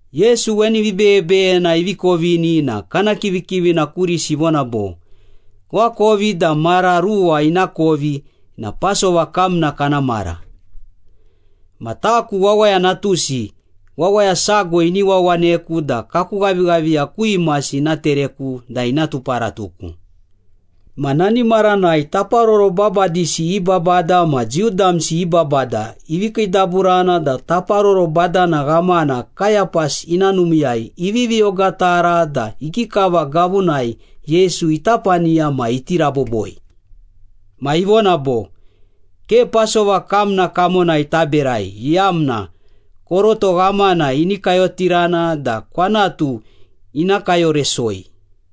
Yesu weni vibeyebeyena ivi kovini na kana kivikivina kurisi ivona bo, “Koakovi da mara ruwa ina kovi na Pasova kamna kana mara. Ma taku Wawaya Natusi, wawaya sago ini wawaneku da kaku ghavighaviya ku imasi ina tereku da ina tuparatuku.” Ma nani maranai taparoro babadisi i babada ma Jiu damsi i babada ivi kiidaburana da taparoro badana ghamana Kayapas ina numiiyai ivivi ogatara da ikikava gavunai Yesu ita paniya ma iti raboboi. Ma ivona bo, “Ke Pasova kamna kamonai taberai iyamna koroto ghamana ini kayotirana da kwanatu ina kayoresoi.”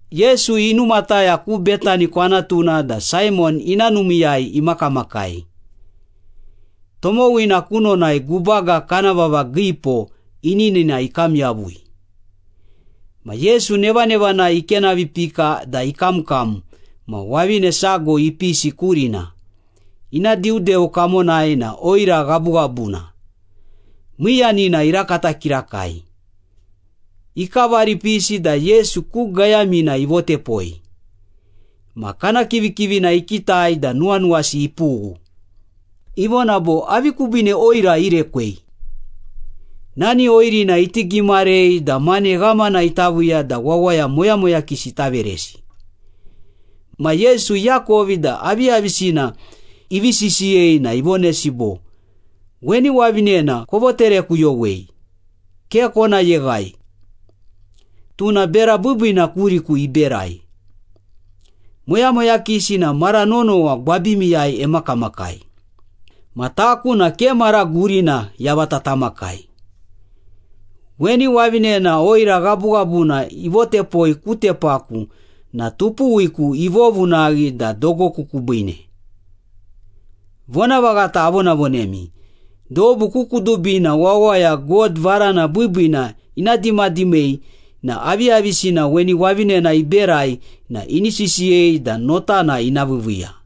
Yesu inumataya ku Betani kwanatuna da Saimon ina numiiyai imakamakai. Tomowina kunonai gubaga kana vava giipo ininina ikam yavui. Ma Yesu nevanevanai ikenavipika da ikamkam ma wavine sago ipisi kurina, ina diudeu kamonai na oira ghabughabuna, miiyanina irakata kirakai. Ikavari ipisi da Yesu ku gayamina ivotepoi. Ma kana kivikivina ikitai da nuwanuwasi ipughu. Ivona bo, “Avi kubiine oira irekwei? Nani oirina iti gimarei da mane ghamana ita viiya da wawaya moyamoyakisi ita veresi.” Ma Yesu iakovi da aviyavisina ivi sisiyei na ivonesi bo, “Weni wavinena kovoterekuyowei, ke kona yeghai. Tuna bera biibiina kuriku iberai. Moyamoyakisi na mara nonowa gwabimiyai emakamakai, ma taku na ke mara gurina yavata tamakai. Weni wavinena oira ghabughabuna ivotepoi ku tepaku na tupuwiku ivovunaghi da dogoku kubiine. Vonavaghata avonavonemi, dobu ku kudubina wawaya God varana biibiina ina dimadimei na aviyavisina weni wavinena iberai na ini sisiyei da notana ina viiviiya.”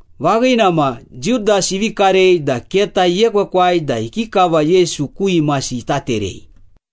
Vaghina ma, Judas ivi karei da keta iekwekwai da ikikava Yesu ku imasi ita terei.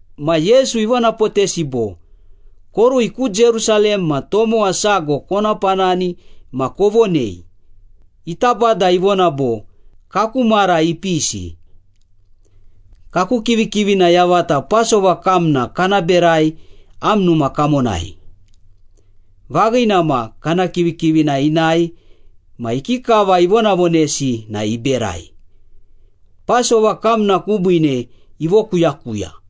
Ma Yesu ivonapotesi bo, “Korui ku Jerusalem ma tomowa sago kona panani ma kovonei, ‘Ita Bada ivona bo, Kaku mara ipisi. Kaku kivikivina yavata Pasova kamna kana berai am numa kamonai.’” Vaghina ma, kana kivikivina inae ma ikikava ivonavonesi na iberai, Pasova kamna kubiine ivokuyakuya.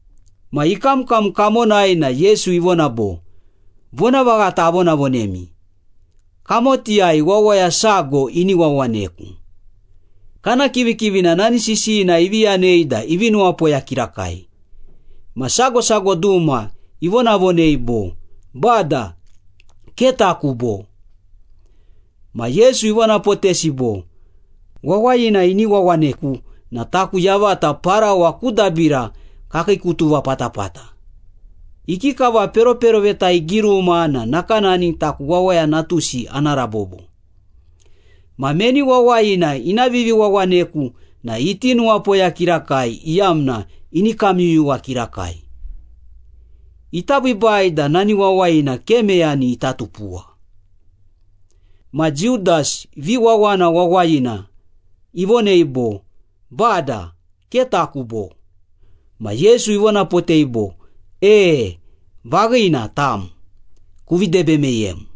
Ma ikamkam kamonai na Yesu ivona bo, “Vonavaghata avonavonemi, kamotiyai wawaya sago ini wawaneku.” Kana kivikivina nani sisiyina ivi yanei da ivi nuwapoya kirakai, ma sago sago duma ivonavonei bo, “Bada, ke taku, bo?” Ma Yesu ivonapotesi bo, “Wawayina ini wawaneku na taku yavata parawa ku dabira kakiikutuva patapata. Ikikava peroperoveta igiruma na nakanani taku Wawaya Natusi ana rabobo. Ma meni wawayina ina viviwawaneku na iti nuwapoya kirakai iyamna ini kamyuyuwa kirakai. Ita biibai da nani wawayina ke meyani ita tupuwa.” Ma Judas, viwawana wawayina, ivonei bo, “Bada, ke taku, bo?” Ma Yesu ivonapotei bo, “E, vaghina, tam. Kuvi debe meyem.”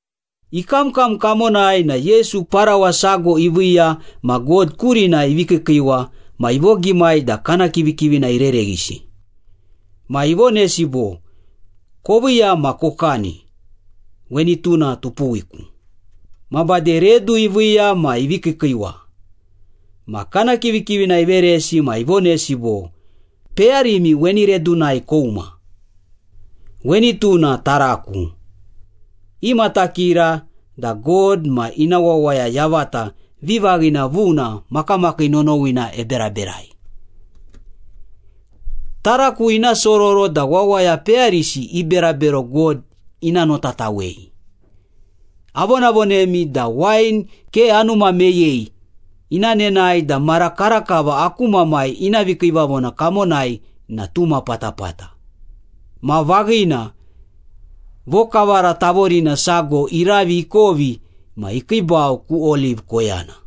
Ikamkam kamonai na Yesu parawa sago iviiya ma God kurina ivi kiikiiwa ma ivogimai da kana kivikivina irereghisi. Ma ivonesi bo, “Koviiya ma kokani. Weni tuna tupuwiku.” Ma bade redu iviiya ma ivi kiikiiwa. Ma kana kivikivina iveresi ma ivonesi bo, “Peyarimi weni redunai kouma. Weni tuna taraku. Imatakira da God ma ina wawaya yavata vivaghina vuna makamakii nonowina eberaberai. Taraku ina sororo da wawaya peyarisi i berabero God ina notatawei. Avonavonemi da wain ke anuma meyei ina nenae da mara karakava aku Mamai ina vikiivavona kamonai na tuma patapata.” Ma vaghina, vokavara tavorina sago iravi ikovi ma ikiibau ku Oliv koyana.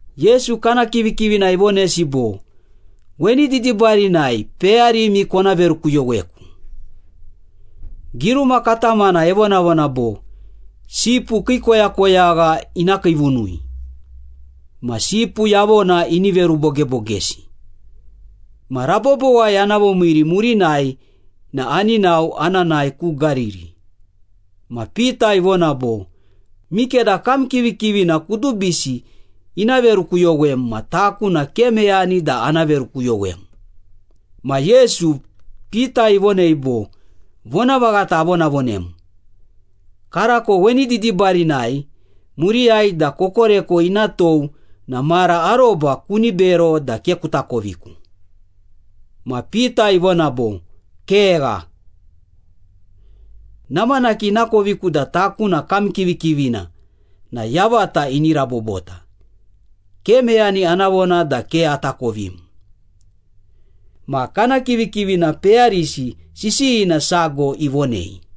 Yesu kana kivikivina ivonesi bo, “Weni didibarinai peyarimi kona verukuyoweku. Giruma katamana evonavona bo, ‘Sipu kii koyakoyagha ina kiivunui, ma sipu yavona ini verubogebogesi.’ Ma rabobowai ana vomiiri murinai na ani nao ana nae ku Gariri.” Ma Pita ivona bo, “Mikeda kam kivikivina kudubisi ina verukuyowem ma taku na ke meyani da ana verukuyowem.” Ma Yesu, Pita ivonei bo, “Vonavaghata avonavonem, karako weni didibarinai, muriyai da kokoreko ina tou na mara aroba kuni bero da ke kuta koviku.” Ma Pita ivona bo, “Kegha! Namanaki inakoviku da taku na kam kivikivina na yavata ini rabobota, ke meyani ana vona da ke atakovim!” Ma kana kivikivina peyarisi sisiyina sago ivonei.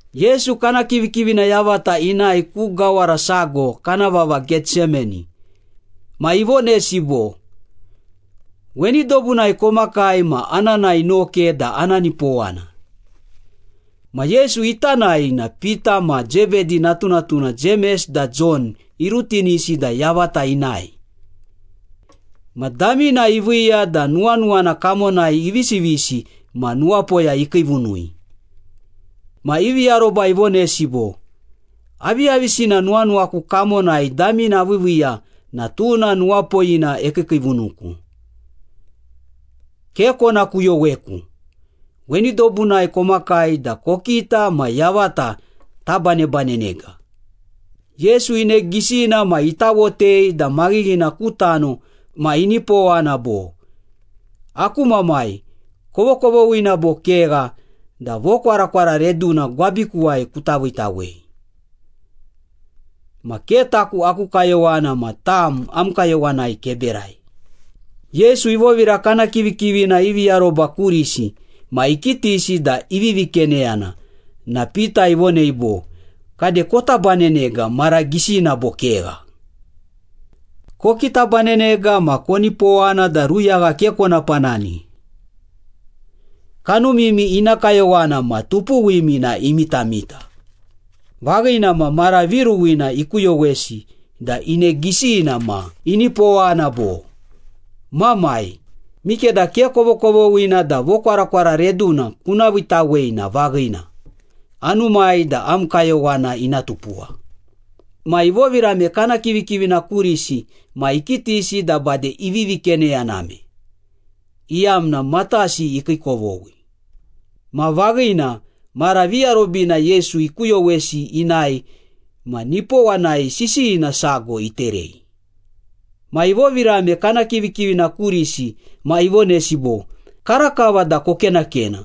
Yesu kana kivikivina yavata inae ku gawara sago kana vava Getsemani, ma ivonesi bo, “Weni dobunai komakai ma ana nae noke da ana nipowana.” Ma Yesu ita nae na Pita ma Zebedi natunatuna Jemes da Jon irutinisi da yavata inae. Ma damina iviiya da nuwanuwana kamonai ivisivisi ma nuwapoya ikiivunui. Ma ivi aroba ivonesi bo, “Aviyavisina nuwanuwaku kamonai damina aviiviiya na tuna nuwapoyina ekiikiivunuku. Ke kona kuyoweku, weni dobunai komakai da kokita ma yavata tabanebanenega.” Yesu ine gisina ma itawotei da maghighina ku tano ma inipowana bo, “Aku Mamai, kovokovoghina bo kegha da vokwarakwara reduna gwabikuwai kuta viitawei. Ma ke taku aku kayowana ma tam am kayowanai keberai.” Yesu ivovira kana kivikivina ivi aroba kurisi ma ikitisi da ivivi keneyana na Pita ivonei bo, “Kade kota banenega mara gisina bo kegha? Kokitabanenega ma konipowana da ruyagha ke kona panani. Kanumimi ina kayowana ma tupuwimi na imitamita.” Vaghina ma, mara viruwina ikuyowesi da ine gisina ma inipowana bo, “Mamai, mikeda ke kovokovoghina da vokwarakwara reduna kuna viitawei na vaghina, anumai da am kayowana ina tupuwa.” Ma ivovirame kana kivikivina kurisi ma ikitisi da bade ivivi keneyaname, iyamna matasi ikiikovoghi. Ma vaghina, mara viarobina Yesu ikuyowesi inae ma nipowanai sisiyina sago iterei. Ma ivovirame kana kivikivina kurisi ma ivonesi bo, “Karakava da kokenakena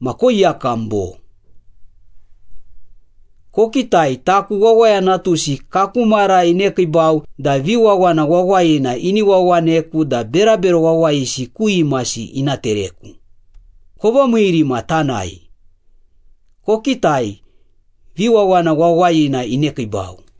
ma koiyakam bo? Kokitai, taku Wawaya Natusi kaku mara inekiibau da viwawana wawayina ini wawaneku da berabero wawayisi ku imasi ina tereku. Kovomiiri ma tanae. Kokitai, viwawana wawayina inekiibau.”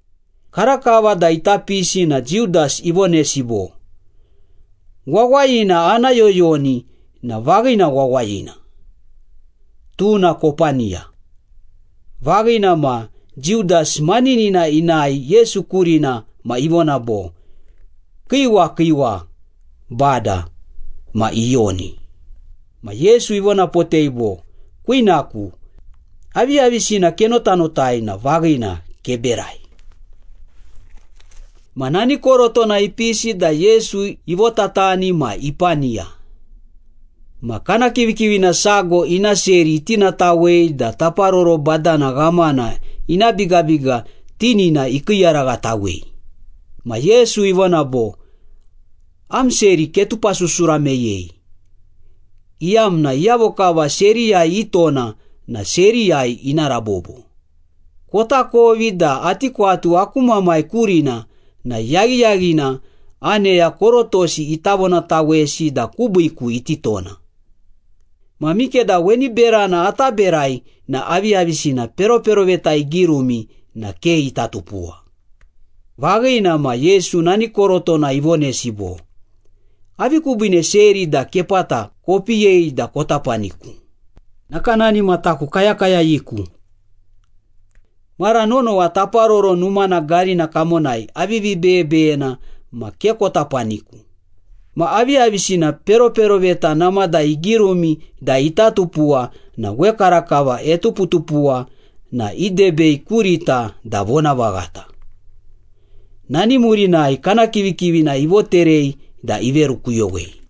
Karakava da ita pisi na Judas ivonesi bo, “Wawayina ana yoyoni na vaghina wawayina. Tuna kopaniya.” Vaghina ma, Judas maninina inae Yesu kurina ma ivona bo, “Kiiwa, kiiwa, Bada.” Ma iyoni. Ma Yesu ivonapotei bo, “Kwinaku, aviyavisina kenotanotai na vaghina, keberai.” Ma nani korotona ipisi da Yesu ivotatani ma ipaniya. Ma kana kivikivina sago ina seri itinatawei da taparoro badana ghamana ina bigabiga tinina ikiiyaraghatawei. Ma Yesu ivona bo, “Am seri ketupasusura meyei, iyamna iyavo kava seriyai itona na seriyai ina rabobo. Kotakovi da ati kwatu aku Mamai kurina na yaghiyaghina aneya korotosi ita vonatawesi da kubiiku iti tona. Ma mikeda weni berana ata berai na aviyavisina peroperoveta igirumi na ke ita tupuwa.” Vaghina ma, Yesu nani korotona ivonesi bo, “Avi kubiine seri da kepata kopiyei da kota paniku, nakanani ma taku kayakayayiku? Mara nonowa Taparoro Numana garina kamonai avivi beyebeyena ma ke kota paniku. Ma aviyavisina peroperoveta namada igirumi da ita tupuwa na wekarakava etuputupuwa na idebei kurita da vonavaghata.” Nani murinai kana kivikivina ivoterei da iverukuyowei.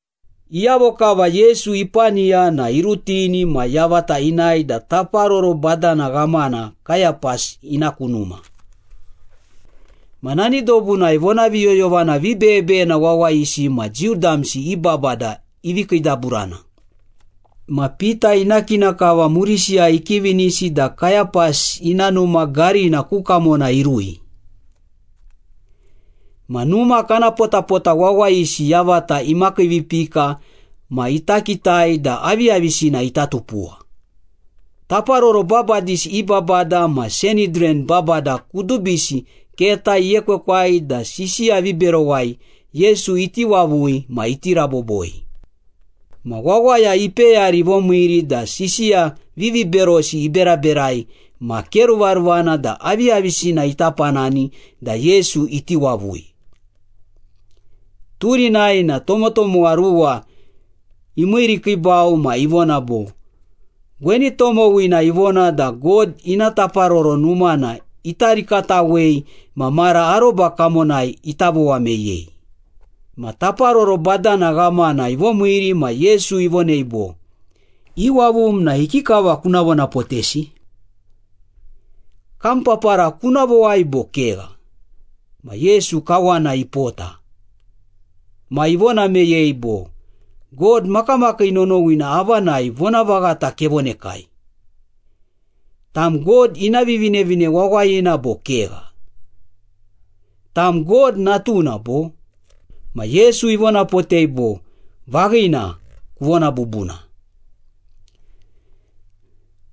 Iyavo kava Yesu ipaniya na irutini ma yavata inae da Taparoro Badana Ghamana Kayapas ina ku numa. Ma nani dobunai vonaviyoyovana vibeyebeyena wawayisi ma Jiu damsi i babada ivi kiidaburana. Ma Pita ina kina kava murisiyai ikivinisi da Kayapas ina numa garina ku kamona irui. Ma numa kana potapota wawayisi yavata imakiivipika ma ita kitai da aviyavisina ita tupuwa. Taparoro babadisi i babada ma Sanhidran babada kudubisi keta iekwekwai da sisiya viberowai Yesu iti wavui ma iti raboboi. Ma wawaya ipeyari ivomiiri da sisiya viviberosi iberaberai ma ke ruvaruvana da aviyavisina ita panani da Yesu iti wavui. Turinai na tomotomowa ruwa imiirikiibau ma ivona bo, “Weni tomowina ivona da God ina Taparoro Numana ita rikatawei ma mara aroba kamonai ita vowa meyei.” Ma taparoro badana ghamana ivomiiri ma Yesu ivonei bo, “Iwavum na ikikava kuna vonapotesi? Kam papara kuna vowai bo kegha?” Ma Yesu kawana ipota. Ma ivona meyei bo, “God makamakii nonowina avanai vonavaghata kevonekai. Tam God ina Vivinevine Wawayina bo kegha? Tam God Natuna, bo?” Ma Yesu ivonapotei bo, “Vaghina, kuvona bubuna.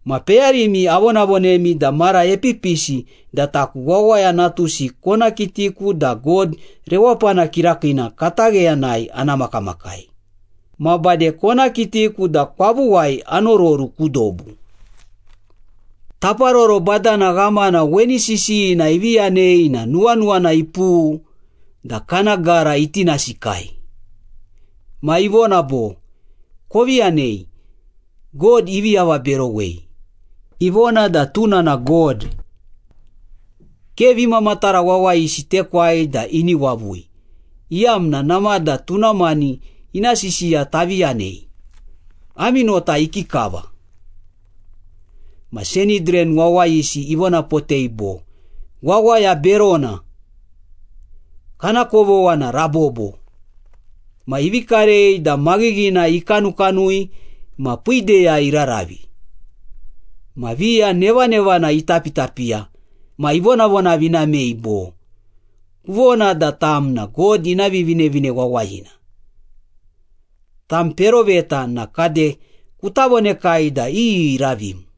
Ma peyarimi avonavonemi da mara epipisi da taku Wawaya Natusi kona kitiku da God Rewapana Kirakiina katagheyanai ana makamakai, ma bade kona kitiku da kwavuwai anororu ku dobu.” Taparoro badana ghamana weni sisiyina ivi yanei na nuwanuwana ipughu da kana gara itinasikai. Ma ivona bo, “Kovi yanei! God ivi avaberowei! Ivona da tuna na God! Ke vimamatara wawayisi tekwai da ini wavui, iyamna namada tuna mani ina sisiya tavi yanei! Ami nota ikikava?” Ma Sanhidran wawayisi ivonapotei bo, “Wawaya berona! Kana kovogha na rabobo!” Ma ivi karei da maghighina ikanukanui ma piideyai iraravi. Ma viya nevanevana itapitapiya ma ivonavonavinamei bo, “Kuvona da tam na God ina Vivinevine Wawayina. Tam peroveta na kade kuta vonekai da iyi iravim.”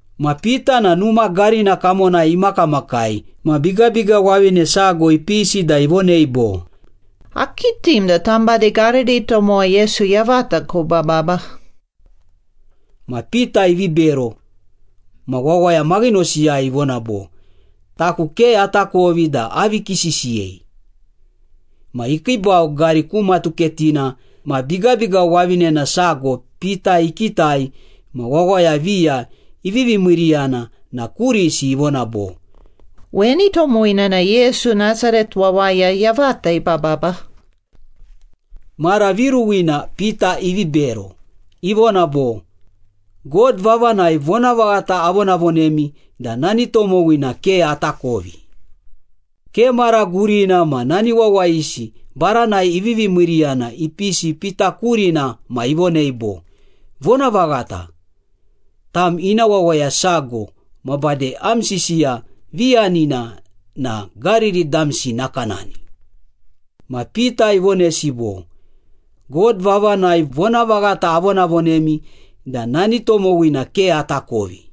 Ma Pita na numa garina kamonai imakamakai ma bigabiga wavine sago ipisi da ivonei bo, “Akitim da tam bade Gariri tomowa Yesu yavata kobababa.” Ma Pita ivi bero ma wawaya maghinosiyai ivona bo, “Taku ke atakovi da avi kisisiyei.” Ma ikiibau gari ku matuketina ma bigabiga wavinena sago Pita ikitai ma wawaya viya ivivi miiriyana na kurisi ivona bo, “Weni tomowina na Yesu, Nasaret wawaya yavata ibababa.” Mara viruwina Pita ivi bero, ivona bo, “God vavanai vonavaghata avonavonemi da nani tomowina ke atakovi.” Ke mara gurina ma nani wawayisi baranai ivivi miiriyana ipisi Pita kurina ma ivonei bo, “Vonavaghata, tam ina wawaya sago ma bade am sisiya viyanina na Gariri damsi nakanani.” Ma Pita ivonesi bo, “God vavanai vonavaghata avonavonemi da nani tomowina ke atakovi.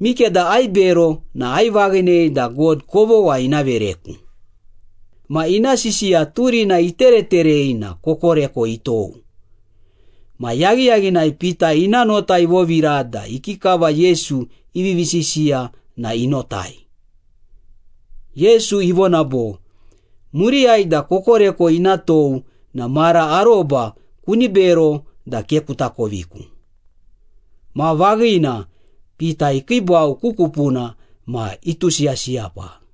Mikeda aibero na aivaghinei da God kovogha ina vereku.” Ma ina sisiya turina itereterei na kokoreko itou. Ma yaghiyaghinai Pita ina nota ivovira da ikikava Yesu ivivi sisiya na inotai. Yesu ivona bo, “Muriyai da kokoreko ina tou na mara aroba kuni bero da ke kuta koviku.” Ma vaghina, Pita ikiibau ku kupuna ma itusiyasiyapa.